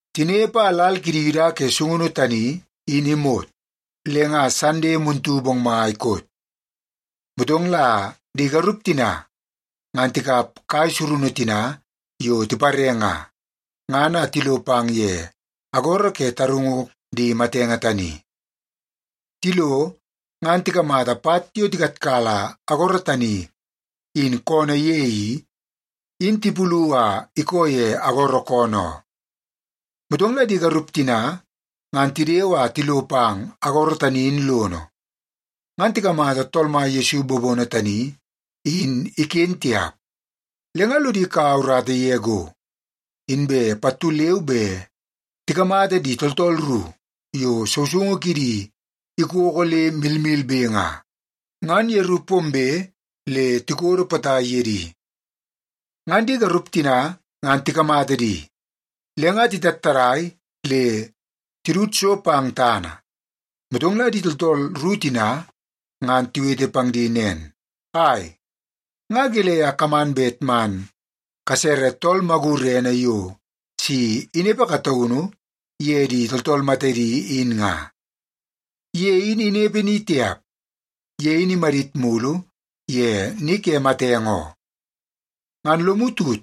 Tinepe a lal kidi Yuda ke sungunu tani in imot, le nga Sande muntu bongmai koot. Motong la di garup tina ngan tikap kai surunu tina yo tipare nga, ngan a tilo pang ye agoro ke tarungu di matenge tani. Tilo, ngan tikamata pat yo tikatkala agoro tani in koonoo ye i, in tipulu a ikoo ye agoro koonoo oo. Motong la di garup tina ngan tidewe a tilo pang agoro tani in lono, ngan tikamata Tool Mai Yesu bobono tani in iken tiap. Le nga lodi kaua urata ye go, inbe pattu leu be tikamata di tooltool ru yo sousoungu kidi ikoko le milmilbe nga, ngan yeru pombe le tikodo potai ye di. Ngan di garup tina ngan tikamata di, le nga titattadai le titud so pang tana. Motong la di tooltool ru tina ngan tiwete pang di nen, “Ai, nga gelei a kaman bet man kasere tool magurene yo si inepe kataunu ye di tooltool matedi in nga? Ye in inepe ni tiap. Ye in imadit mulu ye ni ke matenge oo. Ngan lomu tut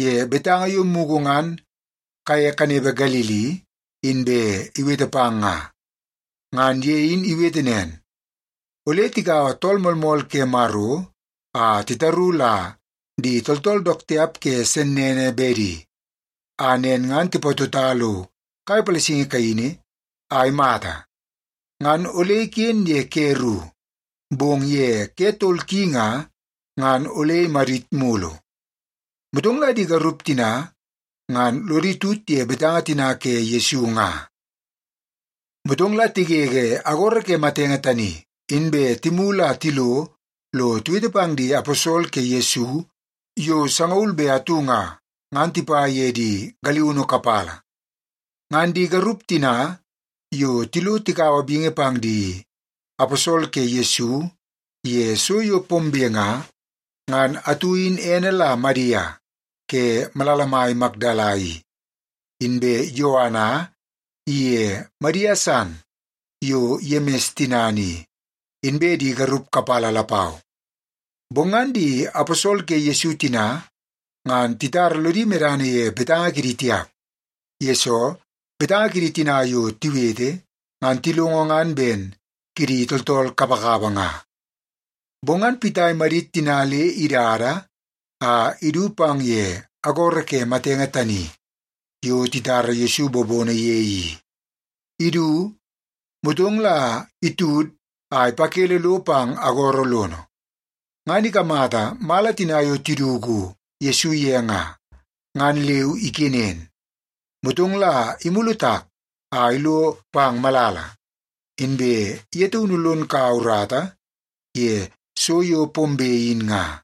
ye betanga yo mugu ngan kaye kanepe Galili inbe iwete pang nga. Ngan ye in iwete nen, ‘Ole tikaua Tool Moolmool ke Maro a titaru la di tooltool dook tiap ke sennene bedi, a nen ngan tipatota lo kai palasingi kaini a imata. Ngan ole iken ye ke ru, bong ye ke tol ki nga, ngan ole amadit mulu.’” Motong la di garup tina ngan lodi tut ye betanga tina ke Yesu nga. Motong la tigege agoro ke matenge tani, inbe timulu a tilo lo tiwete pang di aposol ke Yesu yo sangaul be atu nga, ngan tipa ye di galiunu kapala. Ngan di garup tina yo tilo tikaua bingi pang di aposol ke Yesu ye so yo pombe nga, ngan atu in ene la Madia ke malala mai Makdala i, inbe Yoana iye Madia san yo Yemis tinana i, inbe di garup kapala lapau. Bong ngan di aposol ke Yesu tina ngan titara lodi medana ye betanga kidi tiap, yesoo betanga kidi tina yo tiwete, ngan tilongo ngan ben kidi tooltool kapakapa nga. Bong ngan Pita imadit tina le idada a idu pang ye agoro ke matenge tani yo titara Yesu bobono ye i. Idu, motong la itud a ipakele lo pang agoro lono, ngan ikamata mala tina yo tiduku Yesu ye nga, ngan leu ikenen. Motong la imulu tak a ilo pang malala, inbe ye taunu lon kaua urata ye so yo pombe in nga.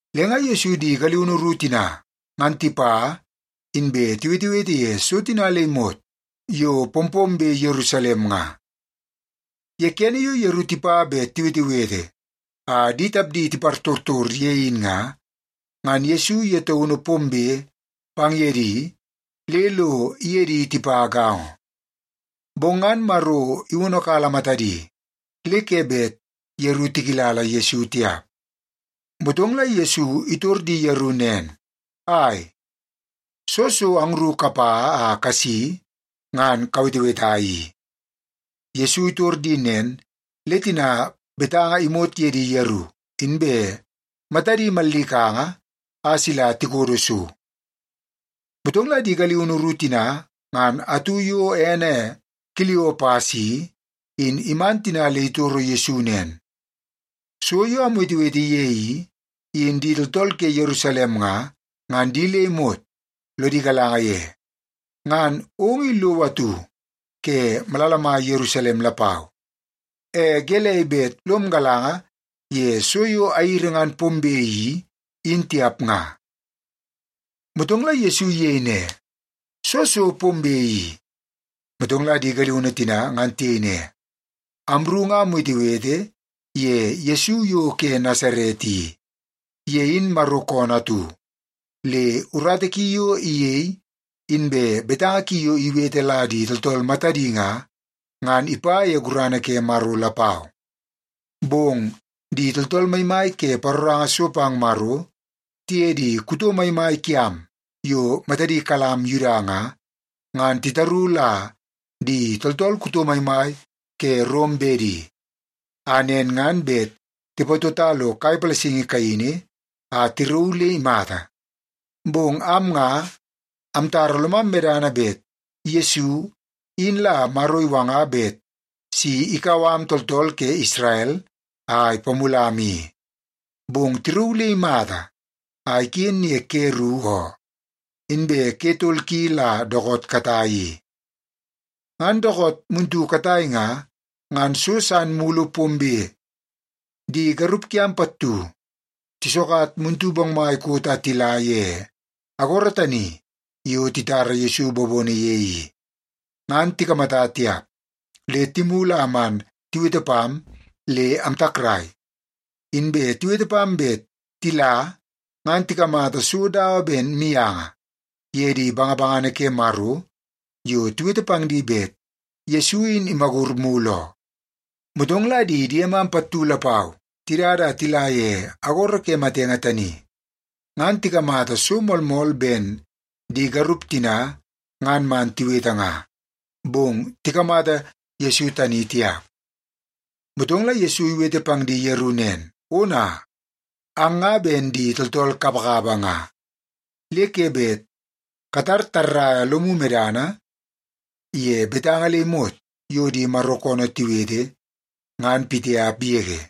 Le nga Yesu di galiunu ru tina ngan tipa, inbe tiwetewete ye so tina le imot yo pompombe Yerusalem nga. Ye kene yo yeru tipa bet tiwetewete a di tapdi tipartortor ye in nga, ngan Yesu ye taunu pombe pang ye di le lo iye di tipa gaongo. Bong ngan Maro iwonokala matadi, le ke bet yeru tikilala Yesu tiap. Motong la Yesu itor di yeru nen, “Ai, soo so angru kapa a kasi ngan kaweteweta i?” Yesu itor di nen, le tina betanga imot ye di yeru, inbe matadi mallikanga a sila tikodo so. Motong la di galiunu ru tina ngan atu yo ene Kiliopas i, in iman tina le itoro Yesu nen, “So yo amwetewete ye i, in di tooltool ke Yerusalem nga, ngan di le imot lodi galanga ye. Ngan ong i lowo atu ke malala mai Yerusalem lapau, e gelei bet lom galanga ye so yo airi ngan pombe i, in tiap nga?” Motong la Yesu iyei ne, “Soo so pombe i?” Motong la di galiunu tina ngan tiyei ne, “Amru nga amwetewete ye Yesu yo ke Nasaret i. Ye in Maro koonoo atu, le urata ki yo iyei inbe betanga ki yo iwete la di tooltool matadi nga, ngan ipa ye gurana ke Maro lapau. Bong di tooltool maimai ke paroranga so pang Maro tiye di kuto maimai kiam yo matadi kalam Yuda nga, ngan titaru la di tooltool kuto maimai ke Rom bedi, a nen ngan bet tipatota lo kai palasingi kaini a tirauu le imata. Bong am nga, amtara lomam medana bet Yesu in la Maro iwanga bet si ikau am tooltool ke Isrel a ipamulam i. Bong tirauu le imata a iken ye ke ru oo, inbe ke tol ki la dookoot katai i. Ngan dookoot muntu katai nga, ngan so san mulu pombe. Di garup kiam pattu tisokat muntu bongmai koot a tila ye agoro tani yo titara Yesu bobono ye i, ngan tikamata tiap le timulu a man tiwete pam le amtakrai. Inbe tiwete pam bet tila ngan tikamata so dawa ben mianga ye di bangabangana ke Maro yo tiwete pang di bet Yesu in imagur mulu oo. Motong la di diemam pattu lapau tidada a tila ye agoro ke matenge tani, ngan tikamata so moolmool ben di garup tina ngan man tiwete nga, bong tikamata Yesu tani tiap.” Motong la Yesu iwete pang di yeru nen, “Ona, ang nga ben di tooltool kapakapa nga, le ke bet katar tarrai lomu medana ye betanga le imot yo di Maro koonoo tiwete, ngan pitiap yege.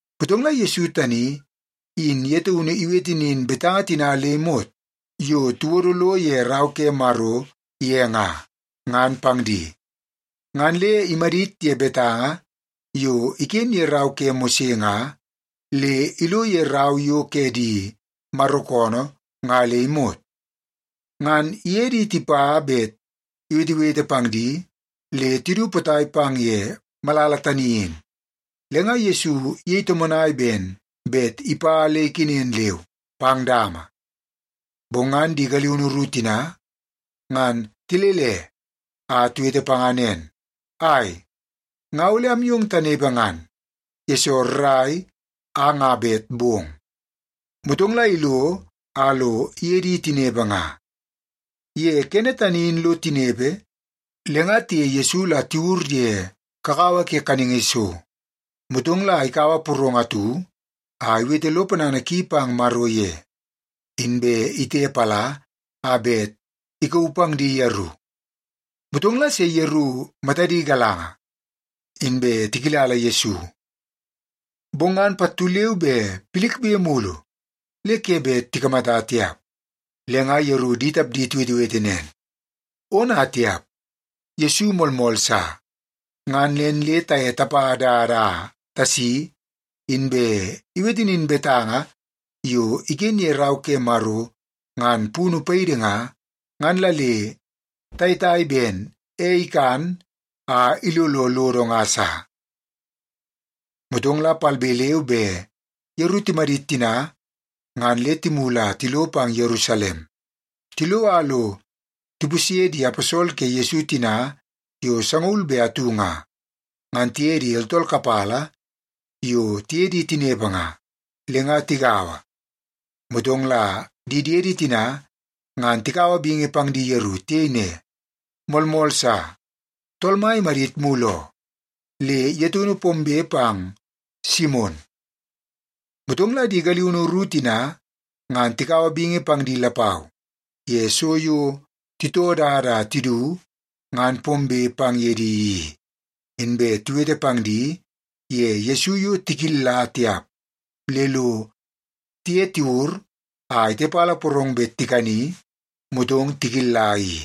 Motong la Yesu tani in ye taunu iwete nin betanga tina le imot yo tiwodo lo ye Rau ke Maro ye nga, ngan pang di. Ngan le imadit ye betanga yo iken ye rau ke Mose nga, le ilo ye rau yo ke di Maro koonoo nga le imot. Ngan iye di tipa bet iwetewete pang di le tidu potai pang ye malala tani in, le nga Yesu iyei tomonai ben bet ipa le ikenen leu pang dama. Bong ngan di galiunu ru tina, ngan tilele a tiwete panga nen, “Ai, nga ole amyong tanepe ngan, yesoo rrai a nga bet bong.” Motong la ilo a lo iye di tinepe nga. Ye kene tani in lo tinepe, le nga tiye Yesu la tiwur ye kakawa ke kaningi so, motong la ikaua porong atu a iwete lo ponana ki pang Maro ye, inbe itepala a bet ikauu pang di yeru. Motong la se yeru matadi galanga, inbe tikilala Yesu. Bong ngan pattu leu be pilikbe mulu le ke bet tikamata tiap. Le nga yeru di tapdi tiwetewete nen, “Ona tiap! Yesu moolmool sa! Ngan nen le taye tapa dada a tasi, inbe iwete nin betanga yo iken ye Rau ke Maro ngan punu paidi nga, ngan la le tayetai ben ei ikan a ilolo lodo nga sa.” Motong la palbe leu be yeru timadit tina ngan le timulu a tilo pang Yerusalem. Tilo a lo tipusye di aposol ke Yesu tina yo sangaul be atu nga, ngan tiye di tooltool kapala yo tiye di tinepe nga. Le nga tigaua, motong la di diedi tina ngan tikaua bingi pang di yeru. Tiyei ne, “Moolmool sa! Tool Mai imadit mulu oo, le ye taunu pombe pang Simon.” Motong la di galiunu ru tina ngan tikaua bingi pang di lapau ye so yo titoo dada a tidu ngan pombe pang ye di i. Inbe tiwete pang di ye Yesu yo tikilla tiap le lo tiye tiwur a itepala porong bet tikani, motong tikilla i.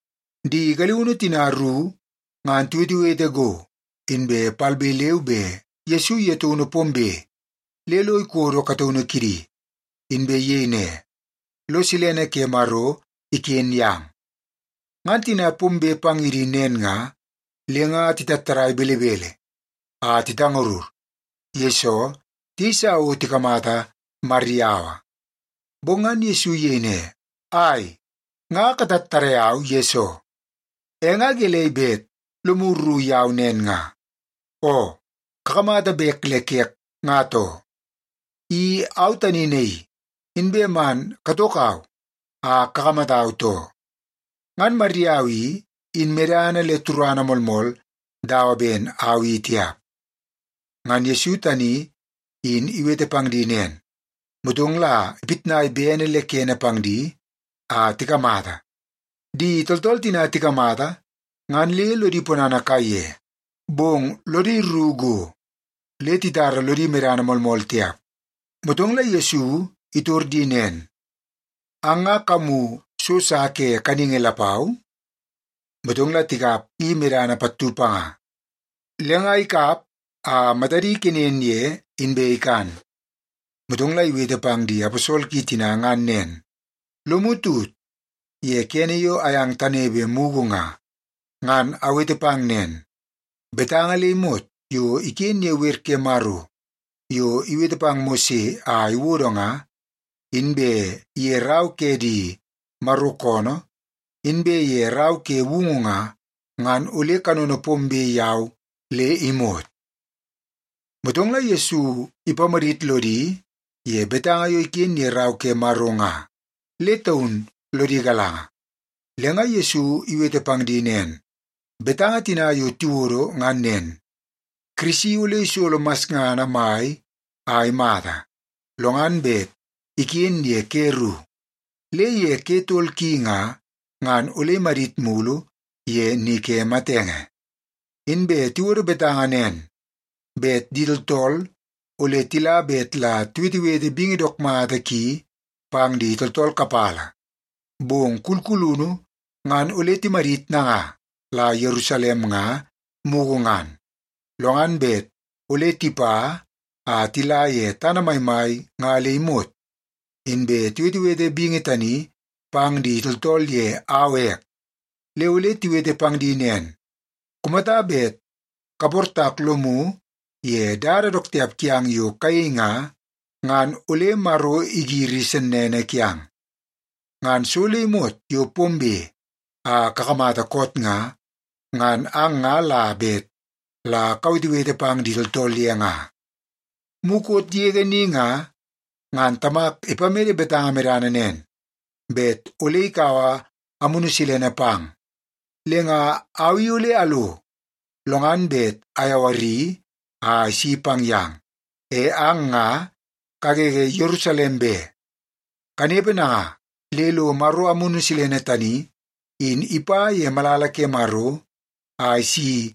Di galiunu tina ru ngan tiwetewete go, inbe palbe leu be Yesu ye taunu pombe le lo ikodo kataunu kidi, inbe iyei ne, “Lo silene ke Maro iken yang.” Ngan tina pombe pang ye di nen nga, le nga titattadai belebele a titangarur, yesoo tiyeisa o tikamata mariyaua. Bong ngan Yesu iyei ne, “Ai, nga katattadai au yesoo? E nga gelei bet lomu rru yau nen nga? Oo, kakamata bek le kek, nga too. I au tani naii! Inbe man katokau a kakamatau, too. Ngan mariyaua i, in medana le turana moolmool dawa ben au i tiap.” Ngan Yesu tani in iwete pang di nen, motong la ipitnai bene le kene pang di a tikamata. Di tooltool tina tikamata ngan le lodi ponana kaiye, bong lodi rru go le titara lodi medana moolmool tiap. Motong la Yesu itor di nen, “Ang nga kamu so sa ke kaningi lapau?” Motong la tikap i mene pattu panga. Le nga ikap a matadi ikenen ye, inbe ikan. Motong la iwete pang di aposol ki tina ngan nen, “Lomu tut ye kene yo ayang tanepe mugu nga, ngan awete pang nen. Betanga le imot yo iken ye wer ke Maro yo iwete pang Mose a iwodo nga, inbe ye rau ke di Maro koonoo, inbe ye Rau ke Woungu nga, ngan ole kanono pombe yau le imot.” Motong la Yesu ipamadit lodi ye betanga yo iken ye Rau ke Maro nga, le taun lodi galanga. Le nga Yesu iwete pang di nen, “Betanga tina yo tiwodo ngan nen: Kirisi ole isolo masngana mai a imata, lo ngan bet iken ye ke ru, le ye ke tol ki nga, ngan ole imadit mulu ye ni ke matenge. Inbe tiwodo betanga nen, bet di tooltool ole tila bet la tiwetewete bingi dook mata ki pang di tooltool kapala. Bong kulkulunu ngan ole timadit nanga la Yerusalem nga, mugu ngan, lo ngan bet ole tipa a tila ye tana maimai nga le imot, inbe tiwetewete bingi tani pang di tooltool ye au ek. Le ole tiwete pang di nen, ‘Kumata bet kaportak lomu ye dada dook tiap kiang yo kayei nga, ngan ole Maro igiri sennene kiang.’ Ngan so le imot yo pombe a kakamata koot nga, ngan ang nga la bet la kawetewete pang di tooltool ye nga. Mukot yege ni nga, ngan Tamak ipamede betanga medana nen, bet ole ikaua Amunu Silene pang. Le nga au i ole alo, lo ngan bet ayawari a isi pang yang. E ang nga kagege Yerusalem be, kanepe nanga le lo Maro Amunu Silene tani in ipa ye malala ke Maro a isi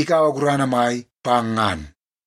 ikaua gurana mai pang ngan.”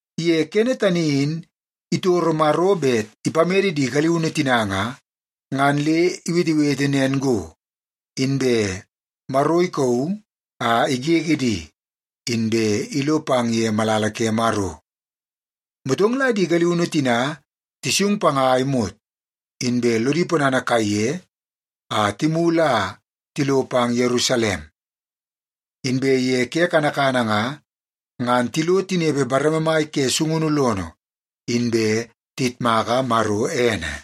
Ye kene tani in itoro Maro bet ipamede di galiunu tina nga, ngan le iwetewete nen go, inbe Maro ikauu a igege di, inbe ilo pang ye malala ke Maro. Motong la di galiunu tina tisung panga a imot, inbe lodi ponana kaiye a timulu a tilo pang Yerusalem. Inbe ye ke kanakana nga, ngan tilo tinepe bareme mai ke sungunu lono, inbe tiyitmaka Maro ene.